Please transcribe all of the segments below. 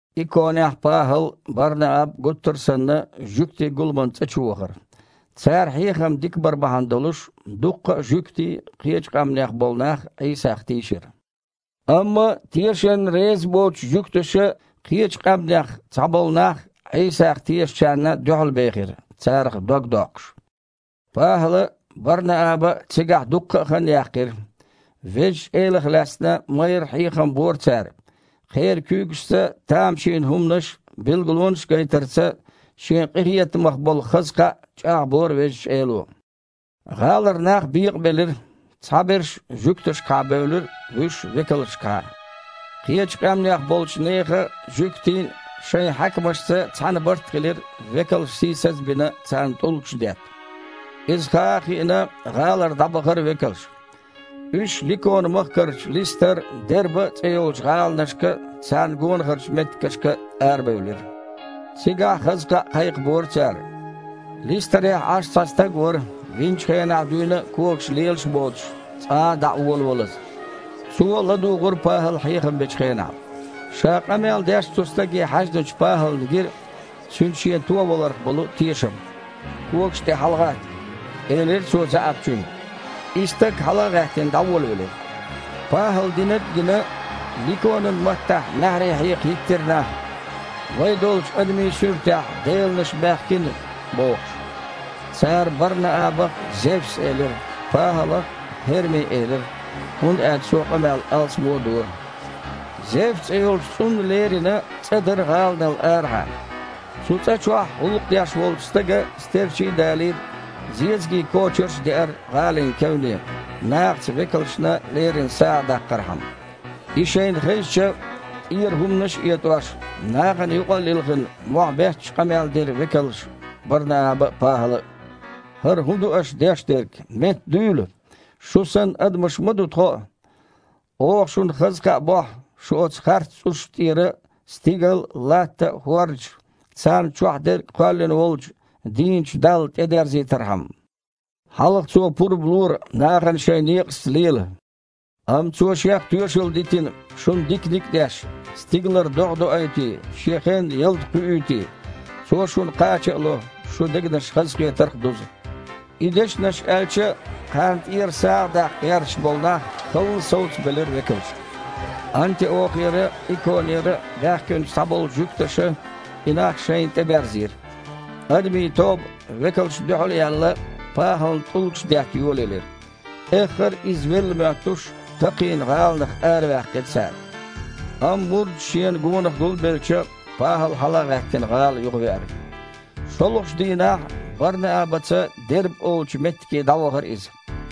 Иконехь ПахІал а, Бар-Нааб а гуттар а санна жуьгтийн гуламан цІа чу вахара. Цара хьехам дика бар бахьана долуш, дуккха а жуьгтий а, кхечу къаьмнех болу нах а Іийсах тийшира. Амма тешарна реза боцучу жуьгташа кхечу къаьмнех цхьаболу нах Іийсах тешначарна дуьхьалбехира, царах дог доккхуш. ПахІала а, Бар-Нааба а цигахь дуккха а хан яьккхира. Везачу Элах лаьцна майрра хьехам бора цара. Кхеран куьйгашца тамашийна хІуманаш а, билгалонаш а гайтарца Шен къинхетамах болу хаза кхаъ чІагІбора Везачу Эло. ГІалара нах бекъабелира. Цхьаберш жуьгташкахьа бевлира, вуьш – векалшкахьа. Кхечу къаьмнех болчу нехан а, жуьгтийн а шайн хьаькамашца цхьаьна барт хилира векалш сийсаз а бина, царна тІулгаш детта. Иза хаа а хиъна, гІалара дІабахара векалш. Уьш Ликона-махкарчу Листар а, Дерба а цІе йолчу гІаланашка а, царна гонахарчу меттигашка а арабевлира. Цигахь хаза кхаъ кхайкхабора цара. Листарехь Іаш цхьа стаг вара, винчу хенахь дуьйна а когаш лелаш а боцуш, цкъа дІа а волавалаза. Цо а ладугІура ПахІала хьехам бечу хенахь. Ша къамел деш цу стаге хьаьжначу ПахІална гира цуьнан шен товаларх болу тешам. «Когаш тІе хьалагІатта!» – элира цо заьІапчуьнга. И стаг, хьала а гІаьттина, дІаволавелира. ПахІала динарг а гина, ликонан маттахь маьхьарий хьекха хІиттира нах: «Вай долчу адамийн суьртехь деланаш баьхкина!» – бохуш. Цара Бар-Наабах Зевс элира, ПахІалах ХІерми элира, хІунда аьлча цо къамел алсамо дора. Зевс цІе йолчу цІунна лерина цІа дара гІаланал арахьа. Цу цІа чохь гІуллакх деш волчу стага стерчий а далийра, зезагийн кочарш а деара гІалин кевне, нахаца векалшна лерина сагІа даккхархьама. И шайна хезча, тІера хІуманаш а этІош, нахана юкъа а лилхина, мохь бетташ къамел дира векалша Бар-Нааба а, ПахІала а: «ХІара хІун ду аша деш дерг? Меттадуьйла! Шу санна, адамаш ма ду тхо а! Оха шуна хаза кхаъ бохьу, шу оцу харц цІушна тІера стигал а, латта а, хІордаш а, царна чохь дерг а кхоьллина волчу дийначу Далла тІедерзийтархьама. Хьалха Цо пурба лора нахана шайн некъашца лела, амма Цо Шех тоьшалла дитина, шуна диканиг а деш: стигалара догІа доуьйтий, шен хенна ялта кхуьуьйтий. Цо шуна кхача а ло, шун дегнаш хазахетарх а дузу». И дешнаш аьлча а, кхарна тІера сагІа даккха гІерташ болу нах халла совцабелира векалшка. Антиохера а, Иконера а баьхкинчу цхьаболчу жуьгташа и нах шайна тІеберзийра. Адамийн тоба, векалшна дуьхьал а яьлла, ПахІална тІулгаш детта йолаелира. Эххар а, иза велла моьттуш, такхийна гІаланах араваьккхира цара. Амма мурдаш шена гонах гулбелча, ПахІал, хьала а гІаьттина, гІала юхавеара. ШолгІачу дийнахь Бар-Наабаца Дерба олучу меттиге дІавахара иза.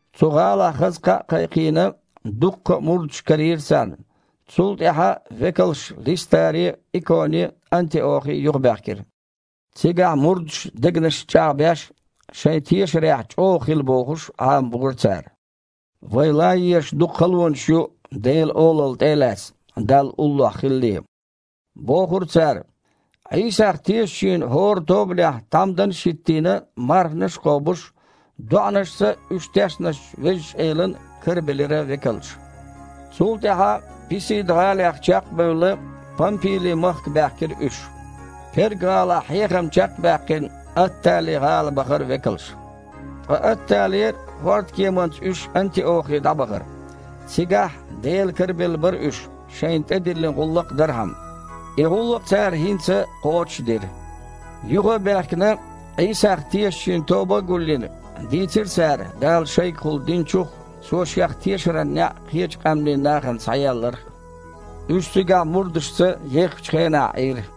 Цу гІалахь хаза кхаъ а кхайкхийна, дуккха а мурдаш карийра царна. Цул тІаьхьа векалш Листаре а, Иконе а, Антиохе а юхабаьхкира. Цигахь, мурдаш дегнашца чІагІбеш, шайн тешарехь чІогІа хила бохуш, Іамабора цара. «Вай лан езаш дукха халонаш ю Делан Олалла тІе а лаьцна, Далла уллохь хилале», – бохура цара. Іийсах тешачийн хІора тобанехь тхьамданаш а хІиттийна, марханаш а кхобуш, доІанашца уьш тешначу Везачу Элан кара белира векалша. Цул тІаьхьа, Писида-гІалех чекх а бевлла, Пампили-махка баьхкира уьш. Перга-гІалахь хьехам чекх а баьккхина, Аттали-гІала бахара векалш. Ткъа Атталера хІордкеманца уьш Антиохе дІабахара. Цигахь Делан кара белла бара уьш, шайна тІедиллина гІуллакх дархьама. И гІуллакх цара хІинца кхочуш а дира. Юха а баьхкина, Іийсах тешачийн тоба а гулйина, дийцира цара Дала шайгахула диначух а, Цо Шех тешаран неІ кхечу къаьмнийн нахана схьаелларх а. Уьш цигахь мурдашца еххачу хенахь Іийра.